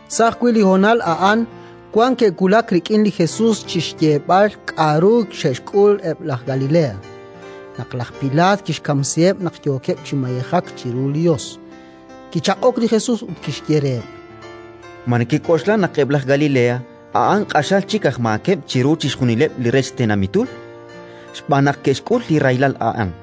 Sa' ajwi' li honal a'an wan ke'wulak rik'in li Jesus chi xyeeb'al k'aru ke'xk'ul eb' laj Galilea, naq laj Pilaat kixkamsiheb' naq yookeb' chi mayejak chiru li Yos. Kichaq'ok li Jesus ut kixye reheb': “Ma nekek'oxla naq eb' aj Galilea a'an q'axal chik aj maakeb' chiru chixjunileb' li rech tenamitul, xb'aan naq ke'xk'ul li rahilal a'an?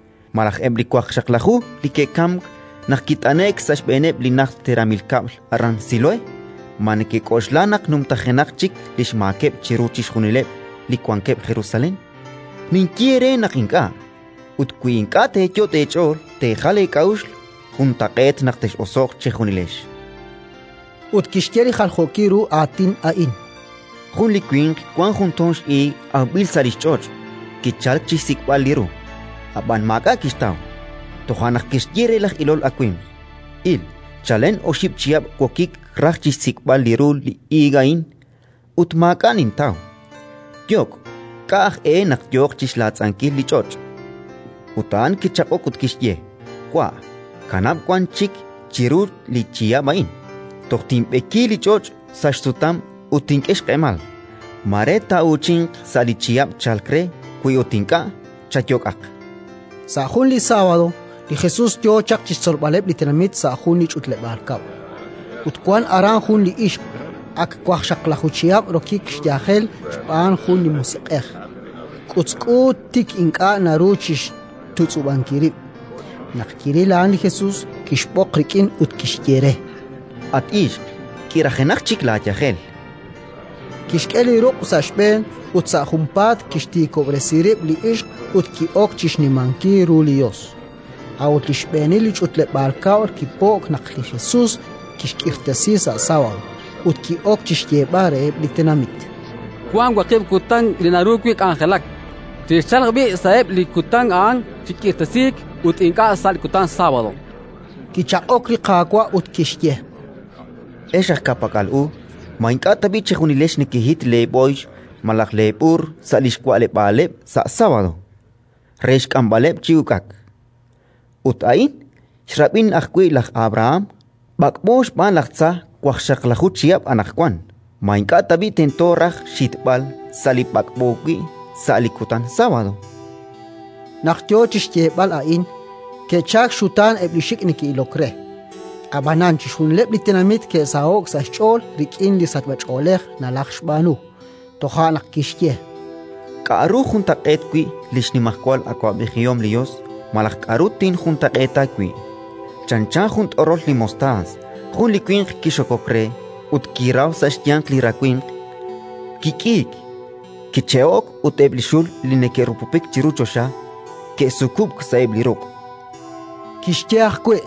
Malaj eb' li waqxaqlaju li ke'kamk naq kit'ane'k sa' xb'eeneb' li najt xteramil kab'l aran Siloé, ma nekek'oxla naq numtajenaq chik li xmaakeb' chiru chixjunileb' li wankeb' Jerusalén? Ninye eere naq ink'a'; ut wi ink'a' teeyot' eech'ool teejal eek'a'uxl, juntaq'eet naq tex'oso'q chejunilex”. Ut kixye li jaljookil ru aatin a'in: “Jun li winq wank jun toon x'iig awb'il sa' li xch'och'. Kichalk chi xsik'b'al li ru, ab'anan maak'a' kixtaw. Toja' naq kixye re laj ilol awimq: «Il, chalen oxib' chihab' wokik raj chi xsik'b'al li ru li iig a'in, ut maak'a' nintaw. Yok'. K'a' aj e naq yo chi xlaatz'ankil li ch'och'?». Ut a'an kichaq'ok ut kixye: «Wa', kanab' wan chik chiru li chihab' a'in, toj tinb'eki li ch'och' sa' xsutam ut tink'e xq'emal. Mare taa'uuchinq sa' li chihab' chalk re; wi ut ink'a', chayok'aq»”. Sa' jun li sábado, li Jesus yo chaq chi xtzolb'aleb' li tenamit sa' jun li ch'utleb'aal kab'l, ut wank aran jun li ixq, ak waqxaqlaju chihab' rokik xyajel xb'aan jun li musiq'ej: k'utzk'u, tik ink'a' naru chi xtutz'ub'ankil rib'. Naq kiril a'an li Jesus, kixb'oq rik'in ut kixye re: —At ixq, k'irajenaq chik laayajel. Kixk'e li ruq' sa' xb'een, ut sa' junpaat kixtiikob'resi rib' li ixq ut ki'ok chi xnimankil ru li Yos. A'ut li xb'eenil li ch'utleb'aal kab'l kipo'k naq li Jesus xk'irtasink sa' sábado; ut ki'ok chi xyeeb'al reheb' li tenamit: —Wank waqib' kutan li naru wi' k'anjelak. Chexchalq b'i' sa'eb' li kutan a'an chi k'irtasiik ut ink'a' sa' li kutan sábado. Kichaq'ok li Qaawa' ut kixye: —Ex aj ka'pak'al u! Ma ink'a' tab'i' chejunilex nekehit leeb'ooyx malaj leeb'uur sa' li xwa'leb'aaleb' sa' sábado, re xk'amb'aleb' chi uk'ak? Ut a'in, xrab'in ajwi' laj Abraham, b'ak'b'o xb'aan laj tza waqxaqlaju chihab' anaqwan, ma ink'a' tab'i' tento raj xhitb'al sa' li b'ak'b'o wi' sa' li kutan sábado? Naq yo chi xyeeb'al a'in, ke'chalk xxutaan eb' li xik' neke'ilok re; ab'anan chixjunileb' li tenamit ke'saho'k sa' xch'ool rik'in li sachb'ach'oolej nalajxb'aanu. Toja' naq kixye: “K'aru juntaq'eet wi' li xnimajwal awab'ejihom li Yos malaj k'aru tinjuntaq'eeta wi'? Chanchan jun t'orol li mostaas. Jun li winq kixokok re ut kiraw sa' xyanq li rawimq. Kik'iik, kiche'ok, ut eb' li xul li neke'rupupik chiru choxa ke'sukub'k sa'eb' li ruq'”. Kixye ajwi':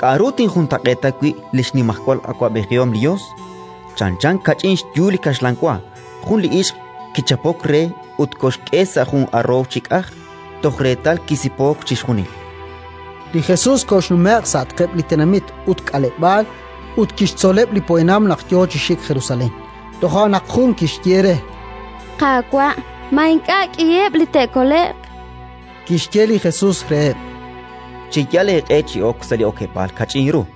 “K'aru tinjuntaq'eeta wi' li xnimajwal awab'ejihom li Yos? Chanchan kach'in xyu li kaxlan wa. Jun li ixq kichapok re ut koxk'e sa' jun aroow chi k'aj, toj reetal kisipook chixjunil”. Li Jesus koxnume'q sa'atqeb' li tenamit ut k'aleb'aal ut kixtzoleb' li poyanam naq yo chi xik Jerusalén. Toja' naq jun kixye re: —Qaawa', ma ink'a' k'iheb' li te'kole'q? Kixye li Jesus reheb': “Cheyal eeq'e chi ok sa' li okeb'aal kach'in ru,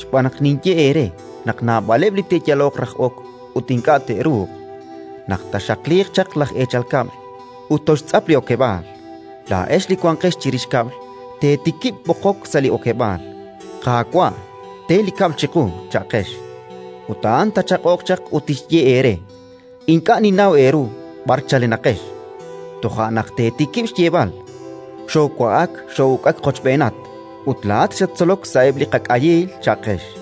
xb'aan naq ninye eere naq naab'aleb' li te'yaloq raj ok ut ink'a' te'ruuq. Naq taaxaqliiq chaq laj eechal kab'l ut toxtz'ap li okeb'aal, laa'ex li wanqex chirix kab'l teetikib' b'oqok sa' li okeb'aal: «Qaawa', te li kab'l chiqu», cha'qex. Ut a'an taachaq'oq chaq ut tixye eere: «Ink'a' ninnaw eeru b'ar chalenaqex». Toja' naq teetikib' xyeeb'al: «Xoowa'ak xoo'uk'ak qochb'eenat, ut laa'at xattzolok sa'eb' li qak'ayiil», cha'qex.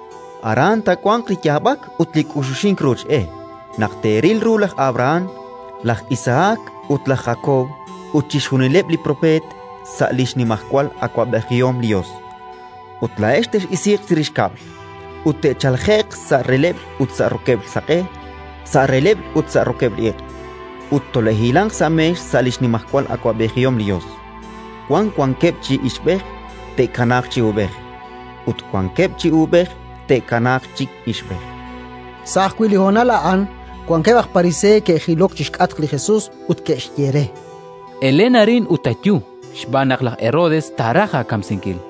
“Aran taawanq li yaab'ak ut li k'uxuxink ruuch e, naq teeril ru laj Abrahán, laj Isahak ut laj Jakob ut chixjunileb' li propeet sa' li xnimajwal awab'ejihom li Yos, ut laa'ex tex'isiiq chirix kab'l. Ut te'chalje'q sa' releb'l ut sa' rokeb'l saq'e, sa' releb'l ut sa' rokeb'l iq', ut tole'hilanq sa' meex sa' li xnimajwal awab'ejihom li Yos. “Wan wankeb' chi ixb'ej: te'kanaaq chi uub'ej; ut wan wankeb' chi uub'ej: te'kanaaq chi ixb'ej”. Sa' ajwi' li honal a'an wankeb' aj Pariseey ke'jilok chi xk'atq li Jesus ut ke'xye re: —Elen arin ut ayu, xb'aan naq laj Herodes taaraj aakamsinkil.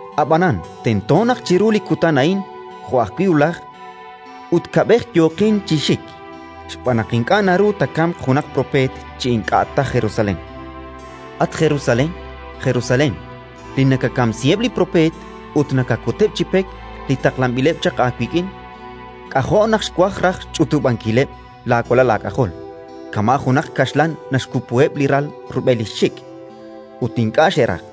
Ab'anan tento naq chiru li kutan a'in jo' ajwi' wulaj ut kab'ej yooqin chi xik, xb'aan naq ink'a' naru taakamq junaq propeet chi ink'a' ta Jerusalén. “At Jerusalén, Jerusalén, li nakakamsiheb' li propeet ut nakakuteb' chi pek li taqlanb'ileb' chaq aawik'in! K'ajo' naq xwaj raj xch'utub'ankileb' laawalal aak'ajol, kama' junaq kaxlan naxkupuheb' li ral rub'el li xxik', ut ink'a' xeraj!